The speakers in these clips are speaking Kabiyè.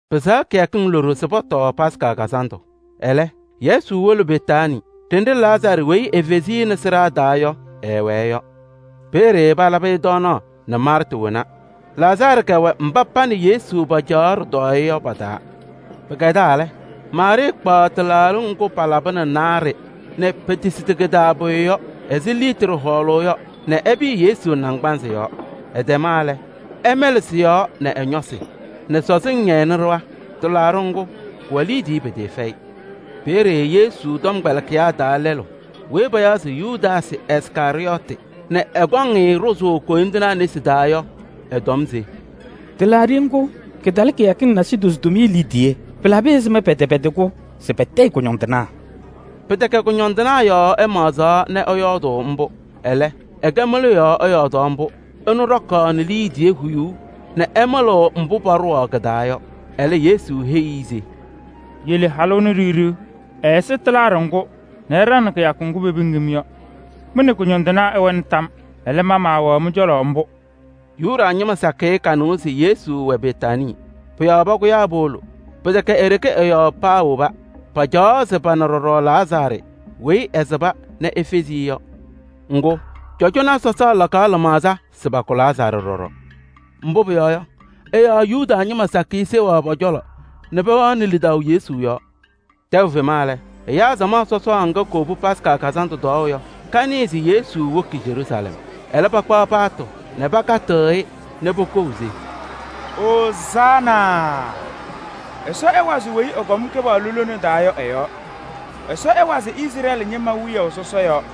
Pɩsɛɣ kɩyakɩŋ loɖo se pɔtɔɔ Yomiye Taa Lɩʋ Kazandʋ. Ɛlɛ, Yesu wolo Betaanii ɖenɖe Lazaarɩ weyi efezi-i nɛ sɩɖaa taa yɔ, ɛwɛɛ yɔ. Peeye palabɩ-ɩ tɔɔnaɣ nɛ Maarta wona. Lazaarɩ kɛwɛ mba pa nɛ Yesu paacaɣ ɖɩtɔɔyɛ yɔ pa-taa. Pɩkɛdaa lɛ, Maarɩɩ kpaɣ tɩlaaɖɩ ŋgʋ palabɩnɩ naarɩ nɛ petesidi kɩ-taa pʋyʋ yɔ ɛzɩ litri hɔɔlʋʋ yɔ nɛ ɛpɩyɩ Yesu naŋgbanzɩ yɔɔ. Ɛtɛma lɛ, ɛmɛlɩ sɩ-yɔɔ nɛ ɛ-ñɔsɩ nɛ sɔzɩŋ ñɛyɩnɩ ɖɩɣa. Tɩlaaɖɩ ŋgʋ, kɩwɛ liidiye pɩtɩɩfɛyɩ. Peeye Yesu tɔmkpɛlɩkɩyaa taa lɛlʋ weyi payaɣ se Yudaasɩ Iskarɩyɔɔtɩ nɛ ɛkɔŋ-ɩ ɖʋzʋʋ koyindinaa nesi taa yɔ, ɛtɔm se: “Tɩlaaɖɩ ŋgʋ, kɩtalɩ kɩyakɩŋ nasidozo tʋmɩyɛ liidiye! Pɩlabɩ ɛzɩma pɛtɛpɛdɩ-kʋ se patayɩ kʋñɔndɩnaa?” Pɩtɛkɛ kʋñɔndɩnaa yɔɔ ɛmaɣzaɣ nɛ ɛyɔɔdɩ mbʋ. Ɛlɛ, ɛkɛ mɩlʋ yɔɔ ɛyɔɔdaɣ mbʋ: ɛnʋ ɖɔkaɣnɩ liidiye huyuu nɛ ɛmɩlɩɣ mbʋ paɖʋwaɣ kɩ-taa yɔ. Ɛlɛ Yesu heyi-i se: “Yele halʋ ɛnʋ ɖiɣ ɖiɣ! Ɛɛsɩ tɩlaaɖɩ ŋgʋ nɛ ɛɖaŋnɩ kɩyakʋ ŋgʋ pepiŋ-m yɔ. Mɩ nɛ kʋñɔndɩnaa ɩwɛnɩ tam yɔɔ. Ɛlɛ, ma maawɛɣ mɩ-cɔlɔ mbʋ.” Yuda ñɩma sakɩyɛ kanɩwa se Yesu wɛ Betaanii. Pʋ-yɔɔ pakʋyaa powolo. Pɩtɛkɛ e-ɖeke ɛ-yɔɔ paawoba. Pacaɣaɣ se pana ɖɔɖɔ Lazaarɩ weyi ɛsɩba nɛ efezi-i yɔ. Ŋgʋ, cɔjɔnaa sɔsaa lakaɣ lɩmaɣza se pakʋ Lazaarɩ ɖɔɖɔ. Mbʋ pʋyɔɔ yɔ, ɛ-yɔɔ Yuda ñɩma sakɩyɛ seɣaɣ pɔ-cɔlɔ nɛ pɛwɛɣnɩ lidaʋ Yesu yɔɔ. Tɛʋ fema lɛ, ɛyaa samaɣ sɔsɔɔ ŋga kowobi Yomiye Taa Lɩʋ Kazandʋ tɔɔʋ yɔ, kanɩɩ se Yesu woki Yeruusalɛm. Ɛlɛ pakpaɣ paatʋ nɛ pakatɩɣ-ɩ nɛ pokou se: “Ozaana! Ɛsɔ ɛwazɩ weyi ɛkɔŋ Kɩpaɣlʋ lone taa yɔ ɛ-yɔɔ! Ɛsɔ ɛwazɩ Izrɛɛlɩ ñɩma wiyaʋ sɔsɔ yɔɔ!”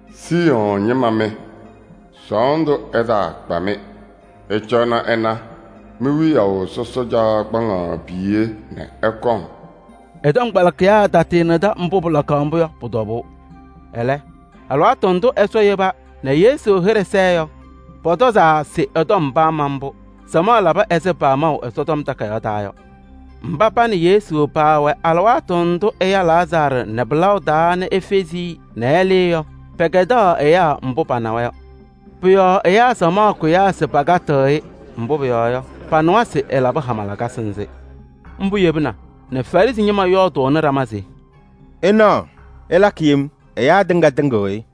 “Siiyɔɔ ñɩma mɩ! Sɔɔndʋ ɛtaakpa-mɩ! Ɩcɔnɩ ɩna, mi-wiyaʋ sɔsɔ caɣ kpaŋaɣ piye nɛ ɛkɔŋ.” Ɛ-tɔmkpɛlɩkɩyaa taanɩdɩ mbʋ pɩlakaɣ mbʋ yɔ pʋ-tɔbʋʋ. Ɛlɛ, alɩwaatʋ ndʋ Ɛsɔ yeba nɛ Yesu hɩɖɛ sɛɛ yɔ, pɔtɔzaa se ɛ-tɔm paama mbʋ, palabɩ-ɩ ɛzɩ pamaʋ yɔ. Mba pa nɛ Yesu paawɛ alɩwaatʋ ndʋ ɛya Lazaarɩ nɛ pɩlaʋ taa nɛ efezi-i nɛ ɛlɩɩ yɔ, pɛkɛdaɣ ɛyaa mbʋ panawa yɔ. Pʋ-yɔɔ ɛyaa samaɣ kʋyaa se pakatɩɣ-ɩ, mbʋ pʋyɔɔ yɔ, panɩwa se ɛlabɩ hama lakasɩ nzɩ. Mbʋ yebina nɛ Farɩsɩ ñɩma yɔɔdʋʋnɩ ɖama se: “Ɩnaɣ, ɩlakɩ yem: ɛyaa tɩŋa tɩŋɩɣ-ɩ!”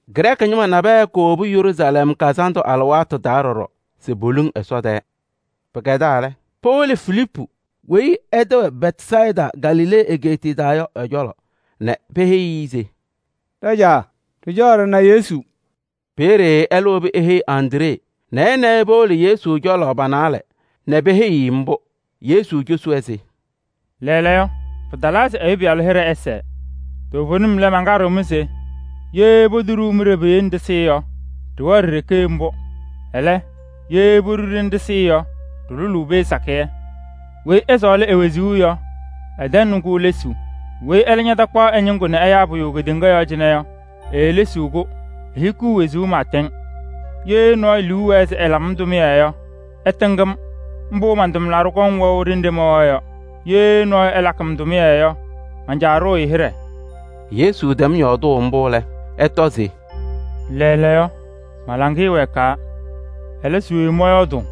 Grɛɛkɩ ñɩma nabɛyɛ kowobi Yeruusalɛm kazandʋ alɩwaatʋ taa ɖɔɖɔ se poluŋ Ɛsɔ tɛɛ. Pɩkɛdaa lɛ, powolo Filiipu weyi ɛ-tɛ wɛ Bɛtsayɩda Galilee egeetiye taa yɔ ɛ-cɔlɔ nɛ peheyi-i se: “Ɖajaa! Ɖɩcaɣ ɖɩna Yesu.” Peeye ɛlɛ wobi eheyi Andree nɛ ɛ nɛ ɩ powolo Yesu cɔlɔ pa-naalɛ nɛ peheyi-i mbʋ. Yesu cosi-wɛ se: “Lɛɛlɛɛyɔ, alɩwaatʋ talaa se Ɛyʋ Pɩyalʋ hɩɖɛ ɛsɛɛ. Toovenim lɛ, mankaɖɩɣ-mɩ se: ye potoɖuu mɩɖɛ piye nɛ ɖɩsɩ yɔ, ɖɩwɛɣ ɖi-ɖeke mbʋ. Ɛlɛ, ye poɖu-ɖɩ nɛ ɖɩsɩ yɔ, ɖɩlʋlʋʋ pee sakɩyɛ. Weyi ɛsɔɔlɩ e-wezuu yɔ, ɛtɛŋnɩ-kʋ lesuu. Weyi ɛlɛ takpaɣ ɛ-ñɩŋgʋ nɛ ɛyaa pʋyʋ kedeŋa yɔɔ cɩnɛ yɔ, eelesiɣ-kʋ, ehikiɣ wezuu pɩɩtɛŋ. Ye nɔɔyʋ liu ɛwɛɛ se ɛlabɩ-m tʋmɩyɛ yɔ, ɛtɩŋ-m. Mbʋ man-tʋmlaɖʋ kɔŋ wɛʋ ɖenɖe mɛwɛɣ yɔ. Ye nɔɔyʋ ɛlakɩ-m tʋmɩyɛ yɔ, man-Caa ɖʋʋ-ɩ hɩɖɛ.” Yesu tɛm yɔɔdʋʋ mbʋ lɛ, ɛtɔ se: “Lɛɛlɛɛyɔ, ma-laŋɩyɛ wɛɛkaa. Ɛlɛ, se we mɔyɔɔdʋʋ?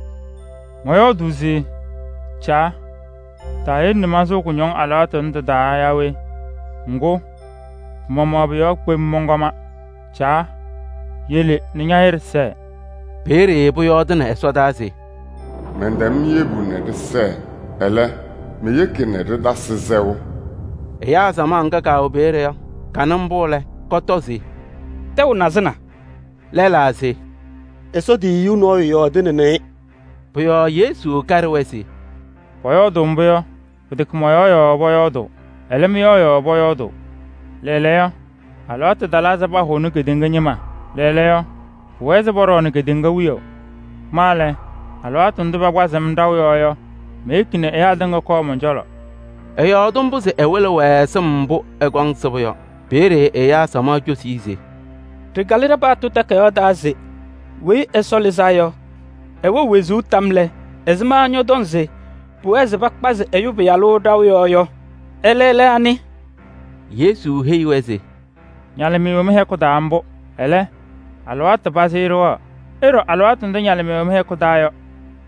Mɔyɔɔdʋʋ se: Caa! Taayele nɛ mansʋʋ kʋñɔŋ alɩwaatʋ tʋnɛ tɩ-taa yaa we? Ŋgʋ, pɩ-maɣmaɣ pʋ-yɔɔ kpem mɔnkɔma. Caa! Yele nɛ ña-hɩɖɛ sɛɛ!” Peeye pʋyɔɔdɩnɩ ɛsɔdaa se: “Mɛntɛm yebu nɛ ɖɩsɛɛ, ɛlɛ, meyeki nɛ ɖɩtasɩ sɛʋ!” Ɛyaa samaɣ ŋga kaawɛ peeye yɔ, kanɩ mbʋ lɛ, kɔtɔ se: “Tɛʋ nazɩna!” Lɛlaa se: “Ɛsɔ tiyiyu nɔɔyʋ yɔɔdɩnɩnɩ-ɩ!” Pʋ-yɔɔ Yesu kaɖɩ-wɛ se: “Pʋyɔɔdʋʋ mbʋ yɔ, pɩtɛkɛ mɔ-yɔɔ yɔɔ pʋyɔɔdʋʋ, ɛlɛ, mɩ-yɔɔ yɔɔ pʋyɔɔdʋʋ. Lɛɛlɛɛyɔ, alɩwaatʋ talaa se pahʋnɩ kedeŋa ñɩma. Lɛɛlɛɛyɔ, pʋwɛɛ se pɔɖɔɔnɩ kedeŋa wiyaʋ. Ma lɛ, alɩwaatʋ ndʋ pakpazɩɣ-m ɖaʋ yɔɔ yɔ, meyeki nɛ ɛyaa tɩŋa kɔɔ mɔn-cɔlɔ.” Ɛyɔɔdɩ mbʋ se ɛwɩlɩ-wɛ sɩm mbʋ ɛkɔŋ sɩbʋ yɔ. Peeye ɛyaa samaɣ cosi-i se: “Ɖɩkalɩ ɖa-paɣtʋ takayaɣ taa se Weyi Ɛsɔ Lɩzaa yɔ, ɛwɛɣ wezuu tam yɔɔ lɛ, ɛzɩma ñɔtɔŋ se pʋwɛɛ se pakpazɩ Ɛyʋ Pɩyalʋ ɖaʋ yɔɔ yɔ? Ɛlɛ lɛ anɩ?” Yesu heyi-wɛ se: “Ñalɩmɩyɛ wɛ mɩ-hɛkʋ taa mbʋ, ɛlɛ, alɩwaatʋ pazɩ ɖɩwɛɣ. Ɩɖɔ alɩwaatʋ ndʋ ñalɩmɩyɛ wɛ mɩ-cɔlɔ yɔ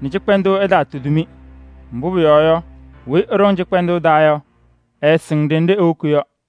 nɛ cɩkpɛndʋʋ ɛtaatudi-mɩ. Mbʋ pʋyɔɔ yɔ, weyi ɛɖɔŋ cɩkpɛndʋʋ taa yɔ, ɛɛsɩŋ ɖenɖe ewoki yɔ.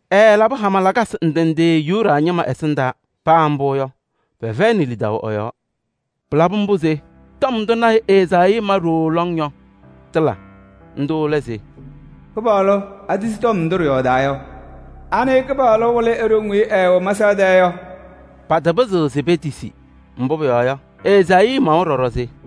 Ɛɛlabɩ hama lakasɩ ndɩ ndɩ Yuda ñɩma ɛsɩndaa, paa mbʋ yɔ, pɛfɛyɩnɩ lidaʋ ɛ-yɔɔ. Pɩlabɩ mbʋ se tɔm ndʋ lɔɔyaɣ tʋ Ezaayii ma ɖooo lɔŋ yɔ, tɩla. Ndʋ lɛ se: “Kɩpaɣlʋ! Atisi tɔm ndʋ ɖɩyɔɔdaa yɔ? Anɩ Kɩpaɣlʋ wɩlɩ e-ɖoŋ weyi ɛɛwɛ mɛsaɣ tɛɛ yɔ?” Patapɩzɩɣ se petisi, mbʋ pʋyɔɔ yɔ, Ezaayii mawa ɖɔɖɔ se: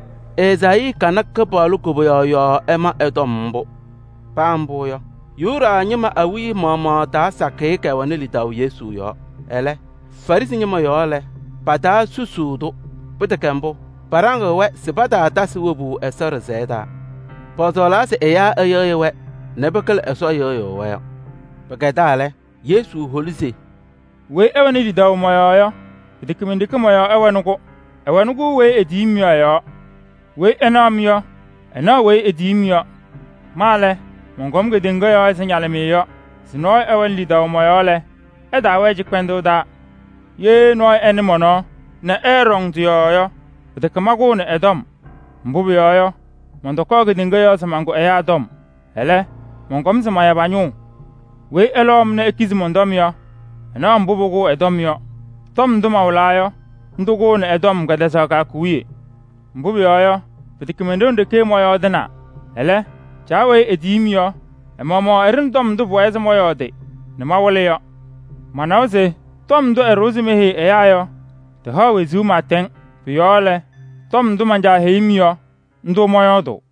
Ezaayii kana Kɩpaɣlʋ koboyaɣ yɔɔ ɛma ɛ-tɔm mbʋ. Paa mbʋ yɔ, Yuda ñɩma awiya maɣmaɣ taa sakɩyɛ kɛwɛnɩ lidaʋ Yesu yɔɔ. Ɛlɛ, Farɩsɩ ñɩma yɔɔ lɛ, pataakaɖɩ mbʋ. Pɩtɛkɛ mbʋ, paɖaŋɩɣ-wɛ se pataatasɩ wobu Ɛsɔ ɖɩsɛyɛ taa. Paasɔɔlaa se ɛyaa ɛyɩɣyɩ-wɛ nɛ pɩkɩlɩ Ɛsɔ yɩɣyʋʋ-wɛ yɔ. Pɩkɛdaa lɛ, Yesu holi se: “Weyi ɛwɛɣnɩ lidaʋ mɔ-yɔɔ yɔ, pɩtɛkɛ men-ɖeke mɔ-yɔɔ ɛwɛnɩ-kʋ, ɛwɛɣnɩ-kʋ weyi etiyi-m yɔ ɛ-yɔɔ. Weyi ɛnaɣ-m yɔ, ɛnaɣ weyi etiyi-m yɔ. Ma lɛ, mɔnkɔm kedeŋa yɔɔ ɛzɩ ñalɩmɩyɛ yɔ se nɔɔyʋ ɛwɛnɩ lidaʋ mɔ-yɔɔ lɛ, ɛtaawɛɛ cɩkpɛndʋʋ taa. Ye nɔɔyʋ ɛnɩ mɔn-tɔm nɛ ɛɛɖɔŋ tɩ-yɔɔ yɔ, pɩtɛkɛ mankʋʋnɩ ɛ-tɔm. Mbʋ pʋyɔɔ yɔ, mɔntɔkɔɔ kedeŋa yɔɔ se mankʋ ɛyaa tɔm, ɛlɛ, mɔnkɔm se maya pa-ñʋʋ. Weyi ɛlɔʋ-m nɛ ekizi mɔn-tɔm yɔ, ɛnaɣ mbʋ pʋkʋʋ ɛ-tɔm yɔ: tɔm ndʋ mawɩlaa yɔ, ndʋ kʋʋnɩ ɛ-tɔm kɛtɛzaɣ kɩyakʋ wiye. Mbʋ pʋyɔɔ yɔ, pɩtɛkɛ mon-ɖoŋ ɖeke mɔyɔɔdɩnaa. Ɛlɛ, Caa weyi etiyi-m yɔ, ɛ-maɣmaɣ ɛɖʋnɩ tɔm ndʋ pʋwɛɛ se mɔyɔɔdɩ nɛ mawɩlɩ yɔ. Manawa se tɔm ndʋ ɛɖʋwa se meheyi ɛyaa yɔ, tɩhaɣ wezuu pɩɩtɛŋ. Pʋ-yɔɔ lɛ, tɔm ndʋ man-Caa heyi-m yɔ, ndʋ mɔyɔɔdʋʋ.”